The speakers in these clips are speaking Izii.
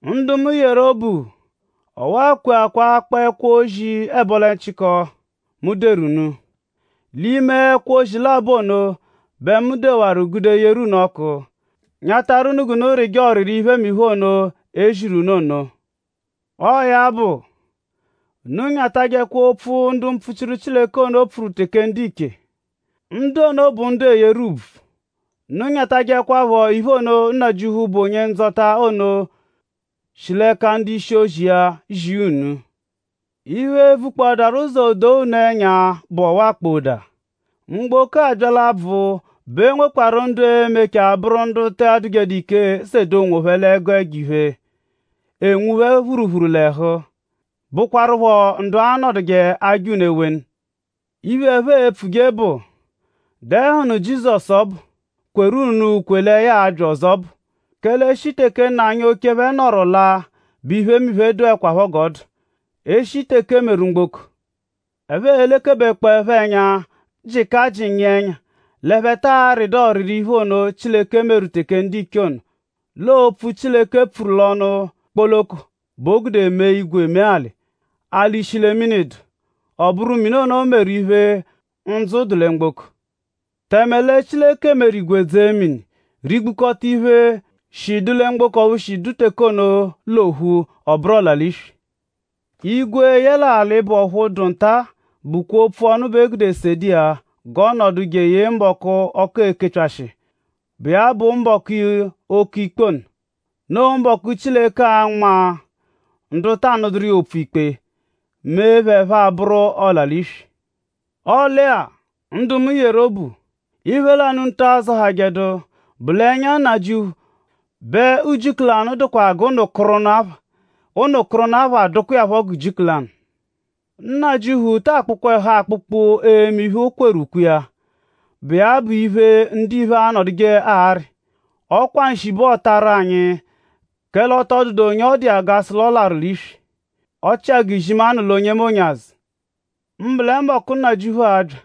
Ndu mu yeru obu; ọwa kweakwa akpọ ẹkwo-ozi ẹbolechiko, mu dewaru unu. L'ime ẹkwo-ozi labọ ono bẹ mu dewaru gude yeru unu ọ́kú; nyatarụ unu g'unu rịje ọriri iphemiphe ono, e ziru unu ono. Ọo ya bụ; unu nyatajẹkwa opfu, ndu mpfuchiru Chileke ono pfuru teke ndiche. Ndu ono bụ ndu eeyeru ùbvù. Unu anyatajẹkwapho iphe ono, Nnajịuphu, bụ Onye-Ndzọta ono shi l'ẹka ndu-ishi-ozi iya zia unu. Iphe, e-vukpọadaru ụzo doo unu ẹnya bụ ọwa kpọada; mgboko-a bya l'abvụ bẹ o nwekwarụ ndu e-mechaa bụru ndu taa dụjedu ike sede onwophẹ l'ẹgu ẹjo-iphe, enwu phẹ phuruphuru l'ẹhu; bụkwarupho ndu a-nọduje aja unu ewenu. Iphe, ẹphe e-pfuje bụ; “?Dẹnuhunu Jizọsu ọbu, kweru unu ukwe lẹ ya a-bya ọzo ọbu? Kẹle e -shi teke nna anyi oche phẹ nọru laa bẹ iphemiphe dụekwapho g'ọ dụ; e -shi teke e meru mgboko.” Ẹphe elekebekpọepho ẹnya; jịka jịnyia ẹnya l'ẹphe taa rịdu ọriri iphe ono, Chileke meru teke ndiche ono. L'ọo opfu, Chileke pfuru l'ọnu kpoloko bẹ o gude mee igwe mee alị. Alị shi lẹ mini dụ; ọ bụru mini ono meru iphe ndzụ dụ lẹ mgboko. Tẹme lẹ Chileke meru igwe dzee mini; rigbukọta iphe, shi dụ lẹ mgboko ọphu shi dụ teke ono l'ophu; ọ bụru ọla-l'iswi. Igwe yẹle alị, bụ ọphu dụ nta-a bụkwa opfu ọnu bẹ e gude sede iya g'ọ nọdu jeye mbọku, ọku e-kepyashị iya, bụ iya bụ mbọku oke ikpe ono. Noo mbọku, Chileke a-nma ndu ta anụduru iya opfu ikpe; mee phẹ ẹphe abụru ọla-l'iswi. Ọle-a; ndu mu yeru obu; iphe lanụ unu ata zọhajedu bụ l'ẹnya nnajịuphu bẹ ujiku lanụ dụkwa iya-a g'ụnu-kụru-ụnu apha; ụnu-kụru-ụnu apha dụkwa iya phọ g'ujiku lanụ. Nnajịuphu ta akpụkwa ẹhu akpụkpu eme iphe, o kweru ukwe iya, bụ iya bụ iphe, ndiphe anọduje arị. Ọ kwa nshi bẹ ọotaru anyi kẹle ọ tọ dụdu onye ọ dụ iya g'a sụ l'ọ larụ l'iswi; ọ chịa g'izimanụ lwa onyemonye azụ. Mbụ lẹ mbọku, Nnajịuphu a-bya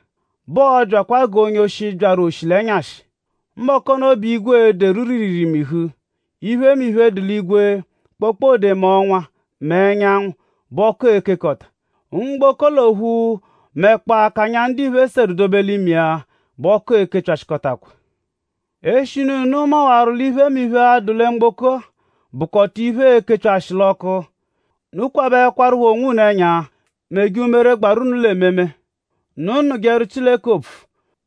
bẹ ọo-byakwa g'onye-oshi byaru oshi l'ẹnyashi. Mbọku ono bẹ igwe e-deru riiriirii mihu. Iphemiphe, dụ l'igwe; kpokpode mẹ ọnwa mẹ ẹnyanwu bẹ ọku e-kekọta. Mgboko l'ophu mẹkpoo akanya, ndiphe seru dobe l'ime iya bẹ ọku e-kepyashịkotakwa. Eshinu unu mawaru l'iphemiphe-a, dụ lẹ mgboko-a bụkota iphe, e-kepyashịhu l'ọku; unu kwabẹkwarupho onwunu ẹnya meje umere, gbaru unu l'ememe. Unu nụjeru Chileke opfu;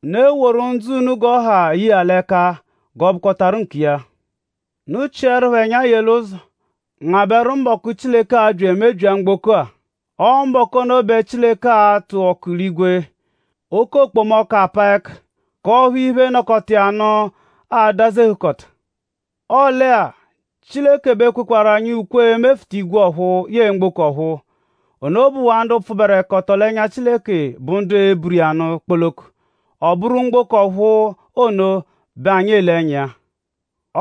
unu eworu ndzụ unu g'ọ ha ye iya l'ẹka g'ọ bụkotaru nkiya. Unu chịerupho ẹnya yee l'ụzo; ngabẹru mbọku, Chileke a-bya emebyia mgboko-a. Ọo mbọku ono bẹ Chileke a-tụ ọku l'igwe; oke okpomọku apaa ẹka; k'ọphu iphe, nọkota iya nụ a-dazehụkota. Ọle-a; Chileke bẹ kwekwaru anyi ukwe emefụta igwe ọ̀phúú yẹe mgboko ọ̀phúú. Ono bụwaa ndu pfụberekoto l'ẹnya Chileke bụ ndu e-buru iya nụ kpoloko. Ọ bụru mgboko ọ̀phúú ono bẹ anyi ele ẹnya iya.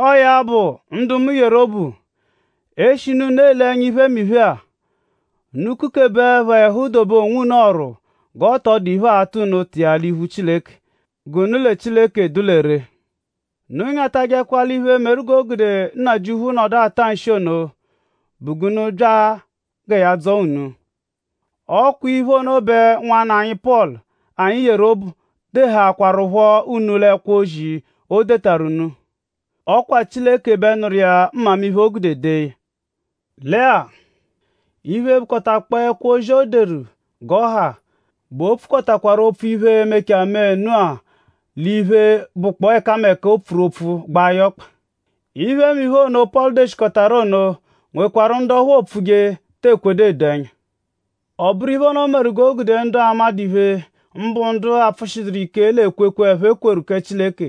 Ọo ya bụ; ndu mu yeru obu; eshinu unu ele ẹnya iphemiphe-a; unu kukebeẹpho ẹhu dobe onwunu ọ̀rù g'ọ tọ dụ iphe, aa-ta unu ụta iya l'iphu Chileke. G'unu lẹ Chileke dụ lẹ ree. Unu anyatajẹkwa l'iphe, meru g'o gude Nnajịuphu nọdu ata nshi ono bụ g'unu bya gẹ ya dzọo unu. Ọ kwaphọ iphe ono bẹ nwanna anyi Pọlu, anyi yeru obu dehaakwaruphọ unu l'ẹkwo-ozi, o detaru unu. Ọ kwa Chileke bẹ nụru iya mmamiphe, o gude dee ya. Lẹ-a; iphe, bụkotakpoo ẹkwo-ozi, o deru g'ọ ha bẹ o pfukọtakwaru opfu iphe-a, e-mechaa mee nụ-a l'iphe, bụkpoo ẹkameka, o pfuru opfu gbaa ya ọkpa. Iphemiphe ono, Pọlu deshikọtaru ono nwekwarụ ndu ọphu oopfuje, te ekwejedu edo ẹnya. Ọ bụru iphe ono meru g'o gude ndu amadụ iphe; mbụ ndu apfụshiduru ike l'ekwekwe, ẹphe kweru kẹ Chileke;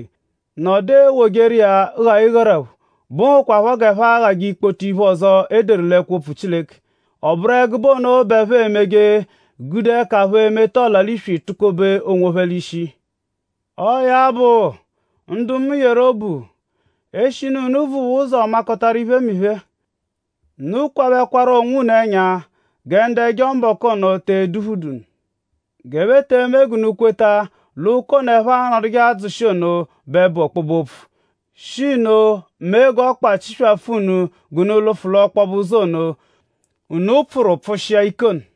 nọdu ewojeru iya gha ịgharaphu, bụhukwaa g'ẹphe aghajẹ ikpoto iphe ọzo, e deru l'ẹkwo-opfu Chileke. Ọ bụru ẹgube ono bẹ ẹphe emeje gude ẹka phẹ meta ọla-l'iswi tukobe onwophẹ l'ishi. Ọo ya bụ; ndu mu yeru obu; eshinu unu vuwaa ụzo makọtaru iphemiphe-a; unu kwabẹkwaru onwunu ẹnya gẹ ndu ẹjo-mbọku ono te eduphu unu; g'ẹphe te eme unu g'unu kweta l'ụka ono, ẹphe anọduje adzụshi ono bẹ bụ ọkpobe-opfu; shi nno mee g'ọkpa chiswafụ unu g'unu lụfu l'ọkpobe ụzo ono, unu pfụru pfụshia ike ono.